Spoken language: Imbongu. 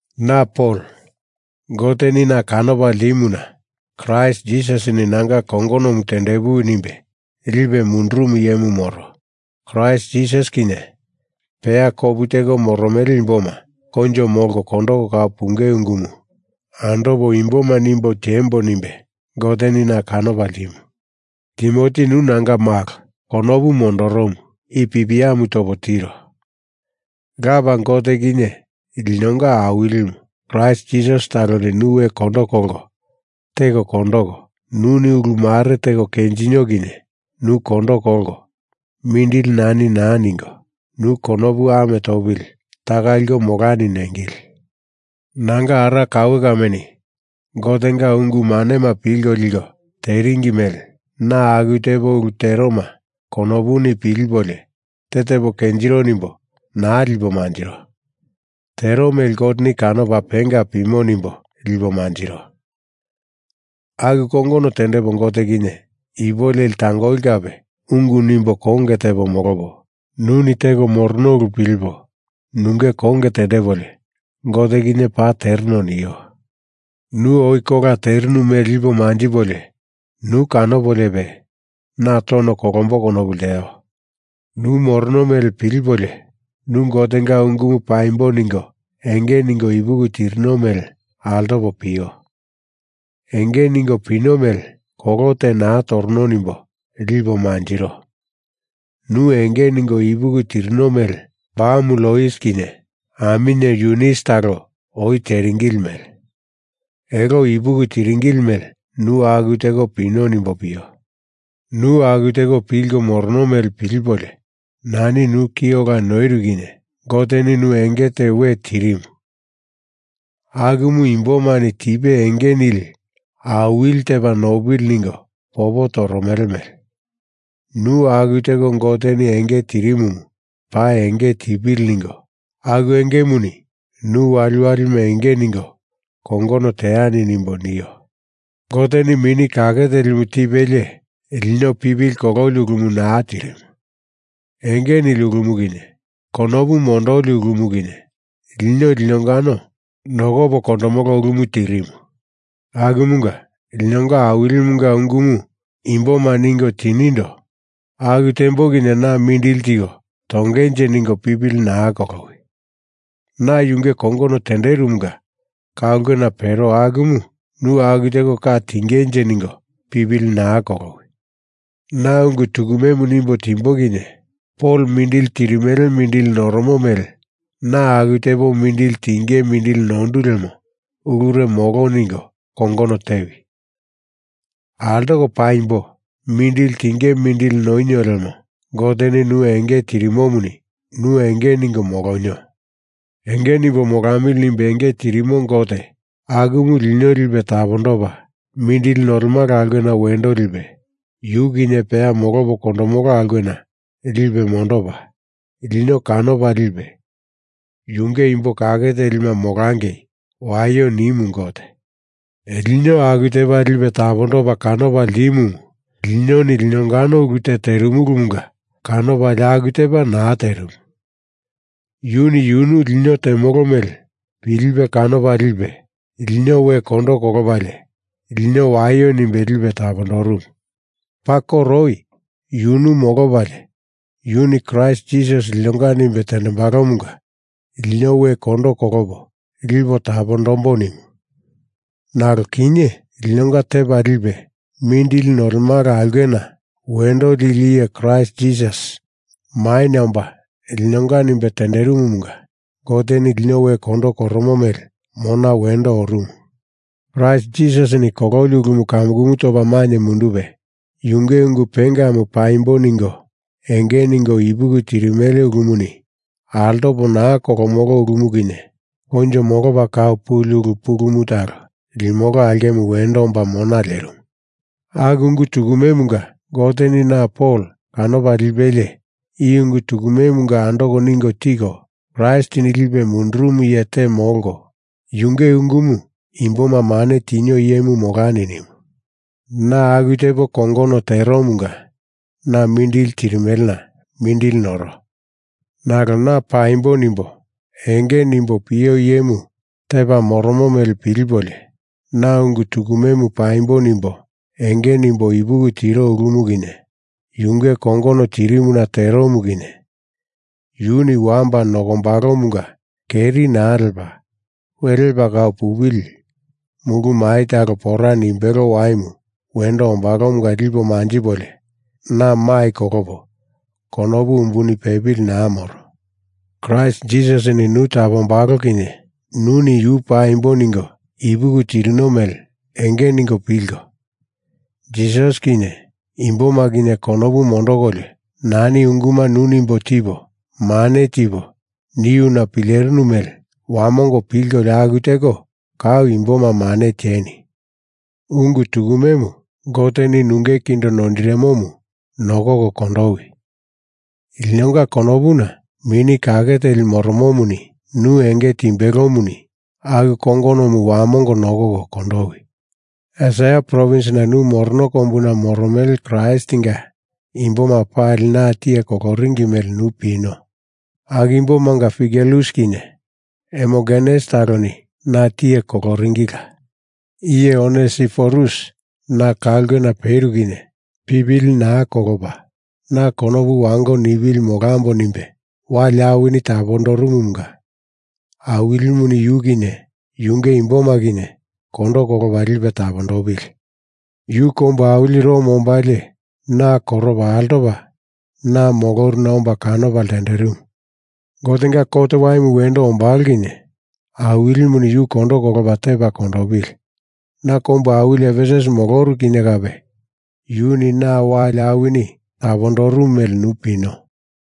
Na Pol, Goteni na kanopa ltimuna Kraist Jisasini nanga kongonomu tendepuwi nimbe lipe mundurumu iyemu moro. Kraist Jisasi kinye peya kopu teko moromele imboma koinjo molko kondoko kau punge ungumu andopa imboma nimbo tiembo nimbe Goteni na kanopa ltimu. Timoti nu nanga malo konopu mondoromu i pipiamu topo tiro. Lapa Gote kinye linonga Awilimu Kraist Jisasi taloni nu we kondo kolko teko kondoko, nuni ulu mare teko kenjinio kinye nu kondo kolko mindili nani naa ningo, nu konopu ame topili taka liko molani nengili. Nanga ara kaue kameni Gotenga ungu manema pilko liko teringi mele na aku tepo ulu teroma konopuni pilipolio te tepo kenjiro nimbo naa lipo manjiro. Tero mele Goteni kanopa penga pimo nimbo lipo manjiro. Aku kongono tendepo Gote kinye ipu leli tangoli kape ungu nimbo konge tepo molopo, nuni teko morono ulu pilipo nunge konge tendepolio, Gote kinye paa tereno nio. Nu oi kola terinu mele lipo manjipolio nu kanopoliope na tono kolombo konopu lteo. Nu morono mele pilipolio, nu Gotenga ungumu paimbo ningo enge ningo ipuki tirino mele altopo pio. Enge ningo pino mele kolo te naa torono nimbo lipo manjiro. Nu enge ningo ipuki tirino mele bamu Lois kinye aminye Yunis talo oi teringili mele. Elo ipuki tiringili mele nu aku teko pino nimbo pio. Nu aku teko pilko morono mele pilipolio, nani nu ki ola noiru kinye Goteni nu enge te we tirimu akumu imbomani tipe enge nili awili tepa nopili ningo popo toromele mele nu aku teko Goteni enge tirimumu paa enge tipili ningo aku engemuni nu waliwalima enge ningo kongono teani nimbo nio. Goteni Mini Kake Telimu tipelie lino pipili kololi ulumu naa tirimu. Enge nili ulumu kinye, konopu mondoli ulumu kinye, lino linongano nokopo kondomolo ulumu tirimu. Akumunga linonga Awilimunga ungumu imboma ningo tinindo aku tembo kinye na mindili tiko tongenje ningo pipili naa kolowi. Na yunge kongono tenderomunga ka ulkena pero akumu nu aku teko ka tingenje ningo pipili naa kolowi. Na ungu tukumemu nimbo timbo kinye Pol mindili tirimele mindili noromo mele na aku tepo mindili tinge mindili nondu lemo ulure molo ningo kongono tewi. Altoko paimbo mindili tinge mindili nonio lemo Goteni nu enge tirimomuni nu enge ningo molonio. Enge nimbo molamili nimbe enge tirimo Gote akumu lino lipe tapondopa mindili nolemala aulkena wendo lipe yu kinye peya molopo kondomolo aulkena lipe mondopa, lino kanopa lipe Yunge imbo kake telima molangei waio nimu Gote. Lino aku tepa lipe tapondopa kanopa ltimumu linoni linongano ulu te terimulumunga kanopalie aku tepa naa terimu. Yuni yunu lino temolo mele pilipe kanopa lipe lino we kondo kolopalie lino waio nimbe lipe tapondorumu. Paa koro oi yunu molopalie yuni Kraist Jisasini linonga nimbe tendembalomunga lino we kondo kolopo lipo tapondombo nimu, nalo kinye, linonga Tepa Lipe Mindili Nolemala Aulkena Wendo Lili Iye Kraist Jisasi maina omba linonga nimbe tenderimumunga Goteni lino we kondo koromo mele mona wendo orumu. Kraist Jisasini kololi ulumu kamukumu topa mainye mundupe, yunge ungu pengamu paimbo ningo enge ningo ipuki tirimele ulumuni altopo naa kolomolo ulumu kinye koinjo molopa kau puli ulu pulumu talo limolo aulkemu wendo omba mona lerimu. Aku ungu tukumemunga Goteni na Pol kanopa lipelie, i ungu tukumemunga andoko ningo tiko, Kraistini lipe mundurumu iye te molko, yunge ungumu imboma mane tinio iyemu molani nimu. Na aku tepo kongono teromunga na mindili tirimelena mindili noro. Nalo na paimbo nimbo enge nimbo pio iyemu tepa moromo mele pilipolio, na ungu tukumemu paimbo nimbo enge nimbo ipuki tiro ulumu kinye, yunge kongono tirimuna teromu kinye, yuni wamba nokombalomunga keri naa lepa we lepa kau pupili mulu mai talo pora nimbelo waimu wendo ombalomunga lipo manjipolio na mai kolopo konopu umbuni pepili naa moro. Kraist Jisasini nu tapondombalo kinye nuni yu paimbo ningo ipuki tirino mele enge ningo pilko, Jisasi kinye imboma kinye konopu mondokolio nani unguma nu nimbo tipo, mane tipo, niuna pilerinu mele wamongo pilkolio aku teko kau imboma mane tieni. Ungu tukumemu Goteni nunge kindo noindirimomu nokoko kondowi. Linonga konopuna Mini Kake Teli moromomuni nu enge timbelomuni aku kongonomu wamongo nokoko kondowi. Esia provins nu morono kombuna moromele Kraistinga imboma pali na tiye koloringi mele nu pino. Aku imbomanga Figelus kinye Hermogenes taloni na tiye koloringilila. Iye Onesiforus na ka ulkena peru kinye pipili naa kolopa, na konopu wango nipili molambo nimbe wali awini tapondorumumunga Awilimuni Yu kinye yunge imboma kinye kondo kolopa lipe tapondopili. Yu kombu awili Rom ombalie na koropa altopa na moloruna omba kanopa lenderimu. Gotenga kot waimu wendo ombalo kinye Awilimuni yu kondo kolopa tepa kondopili. Na kombu awili Efesus moloru kinye kape yuni na wali awini tapondorumu mele nu pino.